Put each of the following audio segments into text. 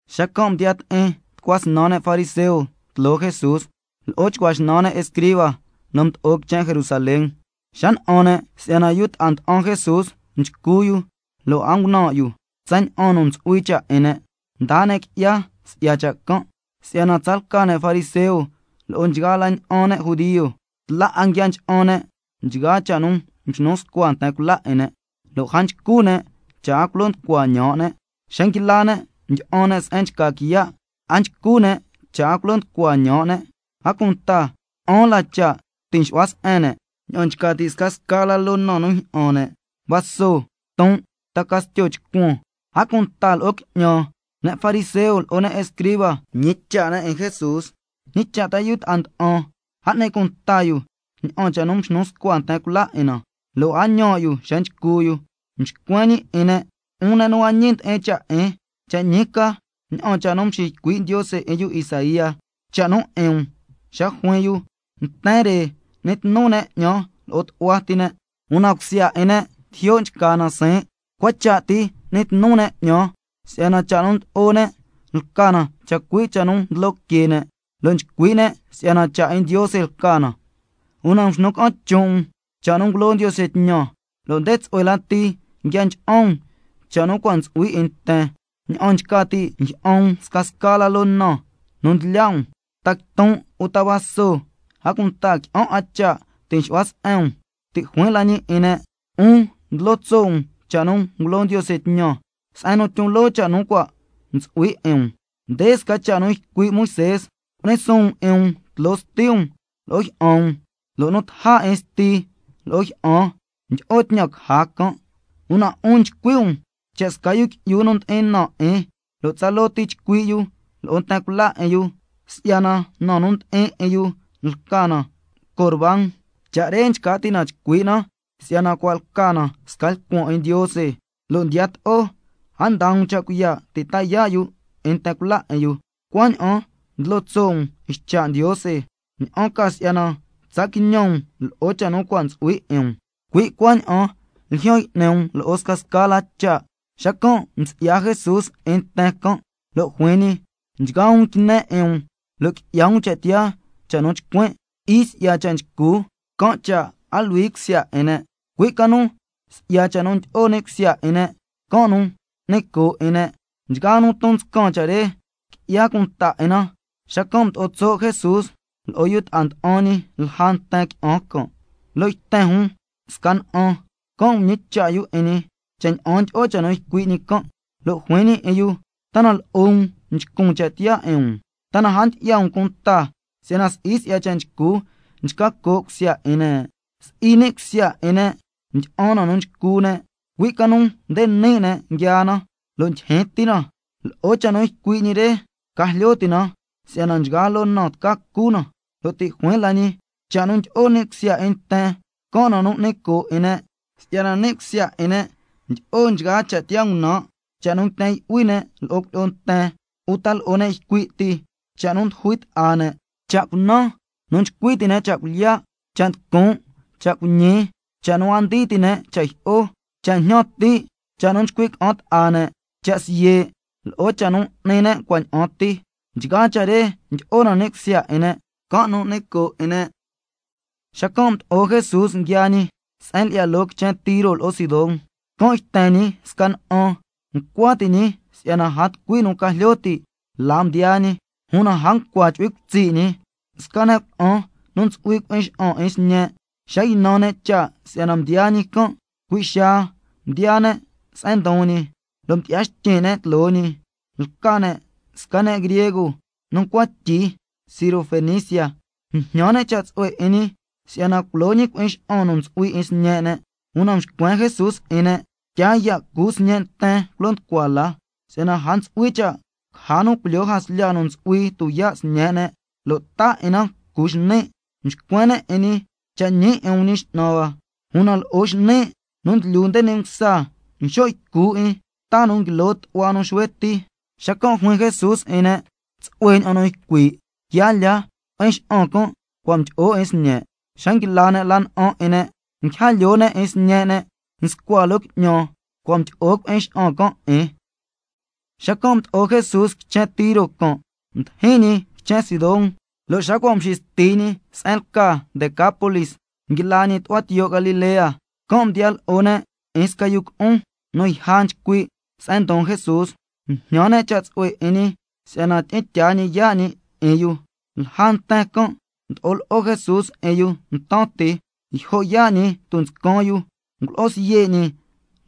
Xacan' mdiya ti'in tucua snan ne' fariseo tloo Jesús, lo'o chcua xnan ne' escriba nu mdo'o quichen Jerusalén. Xa na'an ne' si'yana yu ta'a nda'an Jesús nchcu yu, lo' a ngunan' yu tsaña'an nu ntsu'hui cha' 'in ne', mdaa ne' qui'ya si'ya cha' can'. Si'yana tsalca ne' fariseo lo'o nchgaa la ña'an ne' judio, tla 'a nguia ncha'an ne' nchgaa cha' nu mxnu scua nten cula 'in ne', lo' a nchcu ne' cha' a culo nducua ñaan' ne'. Xa nguila ne' ndyi'an ne' se'en nchca quiya', a nchcu ne' cha' a culo nducua ñaan' ne'. A cunta qui'an la cha' nu ti' nxu'hua se'en ne', ña'an nchca ti' scasca loo na nu njyi'an ne', vaso, quiton', ta castyo chcuan, a cunta lo'o qui'ñan. Ne' fariseo lo'o ne' escriba mñicha' ne' 'in Jesús: ¿Ñi cha' ta yu ta'a nda'an, a n'ni cunta yu ña'an cha' nu mxnu scua nten cula 'in na, lo' a ñaan' yu xa nchcu yu? Mxcuen ñi 'in ne': 'Un ne' nu a ñi ndi'in cha' 'in, cha' ñi ca ña'an cha' nu mxiycui' Ndiose 'in yu Isaía cha' nu 'in um, xa juin yu: —Nten re n'ni tnu ne' 'ñan lo'o tu'hua ti ne', una cusya 'in ne' tijyo' nchca na siin'. Cua cha' ti n'ni tnu ne' 'ñan, si'yana cha' nu ndlo'o ne' lca na chacui' cha' nu ndlo que ne', lo' nchcui' ne' si'yana cha' 'in Ndiose lca na—. Una nxnu ca'an chon' um cha' nu ngulo Ndiose tñan, lo' nde tsu'hue lati nguia ncha'an um cha' nu cua' ntsu'hui 'in nten, ña'an nchca ti' njyi'an um scasca loo na nu ndlya' um, ta quiton', uta vaso, a cunta qui'an 'a cha' ti' nxu'hua se'en um. Ti' juin la ñi 'in ne': 'Un ndlo tso' um cha' nu ngulo Ndiose tñan, se'en nu tyon loo cha' nu cua' ntsu'hui 'in um. Nde sca cha' nu ycui' Moisé: —Cu'ni suun um 'in um tloo sti um lo'o jyi'an um—, lo' —nu taja 'in sti lo'o jyi'an tyi'o tñan caja can'—. Una 'un nchcui' um cha' sca yu qui'yu nu ndi'in na 'in, lo' tsaloo chcui' ti yu lo'o nten cula 'in yu, si'yana na nu ndi'in 'in yu lca na Corbán (cha' re nchca ti' na nchcui' na si'yana cua' lca na sca lcuan 'in Ndiose), lo' ndiyato'o a ndaa um cha' cuiya' ti' ta yaa' yu 'in nten cula 'in yu. Cuaña'an ndlo tso' um ycha' Ndiose, ña'an ca si'yana tsa quiñan um lo'o cha' nu cua' ntsu'hui 'in um. Cui' cuaña'an ljyan y'ni um lo'o scasca la cha'. Xacan' msi'ya Jesús 'in nten can', lo' juin ñi: Nchgaa um quine 'in um, lo' qui'ya um cha' tiyaa cha' nu chcuin'. Si'i si'ya cha' nchcu, can' cha' a luhui cusya 'in ne', cui' ca nu si'ya cha' nu ndyi'o ni' cusya 'in ne', can' nu n'ni coo' 'in ne'. Nchgaa nu ndon nscan cha' re, qui'ya cunta 'in na. Xacan' mdo'o tso' Jesús lo'o yu ta'a nda'an ñi lja nten qui'an can', lo' yten jun sca na'an, can' mñicha' yu 'in ñi, cha' ña'an ndyi'o cha' nu ycui' ñi can'. Lo' juin ñi 'in yu: ¿Ta na lo'o um nchcun cha' tiyaa 'in um? ¿Ta na a ndyi'ya um cunta si'yana si'i si'ya cha' nchcu, nchca coo' cusya 'in ne'? Si'i ni' cusya 'in ne' ndyi'an na nu nchcu ne', cui' ca nu nde ni' ne' nguiaa na lo' ndyijyin ti na. Lo'o cha' nu ycui' ñi re ca jlyo ti' na si'yana nchgaa loo na tca cu na. Lo' ti' juin la ñi: Cha' nu ndyi'o ni' cusya 'in nten, can' na nu n'ni coo' 'in ne'. Si'yana ni' cusya 'in ne' ndyi'o nchgaa cha' tiyaa ngunan', cha' nu nguiten yu'hui ne' lo'o cuilyi'o nten uta lo'o ne' ycui' ti, cha' nu ndujui ta'a ne', cha' cunan, nu nchcui ti' ne' cha' cuilyiya', cha' nducun', cha' cuiñi, nu a ndii ti' ne' cha' jyi'o, cha' njñan ti', cha' nu nchcui' ca'an ta'a ne', cha' siye', lo'o cha' nu n'ni ne' cua' ña'an ti. Nchgaa cha' re ndyi'o ni' cusya 'in ne', can' nu n'ni coo' 'in ne'. Xacan' mdo'o Jesús nguiaa ñi se'en lyi'ya loo quichen Tiro lo'o Sidón, can' yten ñi sca na'an, ncua ti' ñi si'yana a tucui nu ca jlyo ti' la mdiyaa ñi, una a ncua chu'hui cutsi' ñi. Sca ne' cuna'an nu ntsu'hui cui'in xa'an 'in sñe', xa ynan ne' cha' si'yana mdiyaa ñi can', cui' xaa mdiyaa ne' se'en ndon ñi, lo' mdyi'ya xtyin' ne' tloo ñi. Lca ne' sca ne' griego nu ncua tyi Sirofenicia, mjñan ne' cha' tsu'hue 'in ñi si'yana culo ñi cui'in xa'an nu ntsu'hui 'in sñe' ne'. Una mxcuen Jesús 'in ne': Tyaa ya' cu sñe' nten culo nducua la, si'yana a ntsu'hui cha' caja nu culyaa jaslya nu ntsu'hui tuyaa' sñe' ne', lo' taa 'in na cu xni'. Mxcuen ne' 'in ñi: Cha' ñi 'in um Ñi X'nan hua, una lo'o xni' nu ndlyu nde ni' msa, nxo' ycu 'in ta nu nguilo tu'hua nu xuhue ti. Xacan' juin Jesús 'in ne': Tsu'hue ña'an nu ycui', quia lya, cui'in xa'an can' cua' mdyi'o 'in sñe'. Xa nguila ne' la na'an 'in ne', nguija lyoo ne' 'in sñe' ne' nscua loo qui'ñan, cua' mdyi'o cui'in xa'an can' 'in. Xacan' mdo'o Jesús quichen Tiro can', mdijin ñi quichen Sidón, lo' xa cua' mxisti ñi se'en lca Decápolis, xacan' nguila ñi tu'hua tiyo' Galilea. Can' mdiya lo'o ne' 'in sca yu cu'un nu yja nchcui' se'en ndon Jesús, mjñan ne' cha' tsu'hue 'in ñi si'yana tyi'in tyaa ñi yaa' ñi 'in yu. Lja nten can' mdo'o lo'o Jesús 'in yu ntan ti, yjo' yaa' ñi tunscan yu, ngulo'o siye' ñi,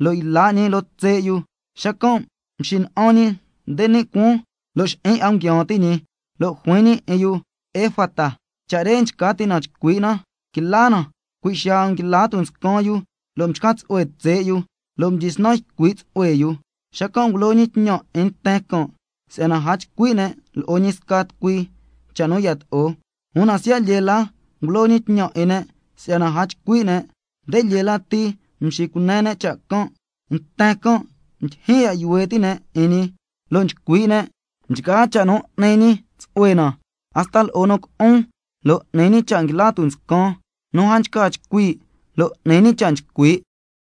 lo' yla' ñi loo tse' yu, xacan' mxina'an ñi nde ni' cuaan, lo' xi'in 'a nguiaan ti' ñi, lo' juin ñi 'in yu: Efata. Cha' re nchca ti' na nchcui' na: Quila na. Cui' xaa nguila tunscan yu lo' mchca tsu'hue tse' yu, lo' mdyisnan ycui' tsu'hue yu. Xacan' ngulo ñi tñan 'in nten can' si'yana a chcui' ne' lo'o ñi sca tucui cha' nu yato'o. Una siya' lyee la ngulo ñi tñan 'in ne' si'yana a chcui' ne', nde lyee lati mxicune ne' cha' can'. Nten can' ndyijyin ya' yuhue ti' ne' 'in ñi lo' nchcui' ne': Nchgaa cha' nu n'ni ñi tsu'hue na, hasta lo'o nu cu'un lo' n'ni ñi cha' nguila tunscan, nu a nchca chcui' lo' n'ni ñi cha' nchcui'.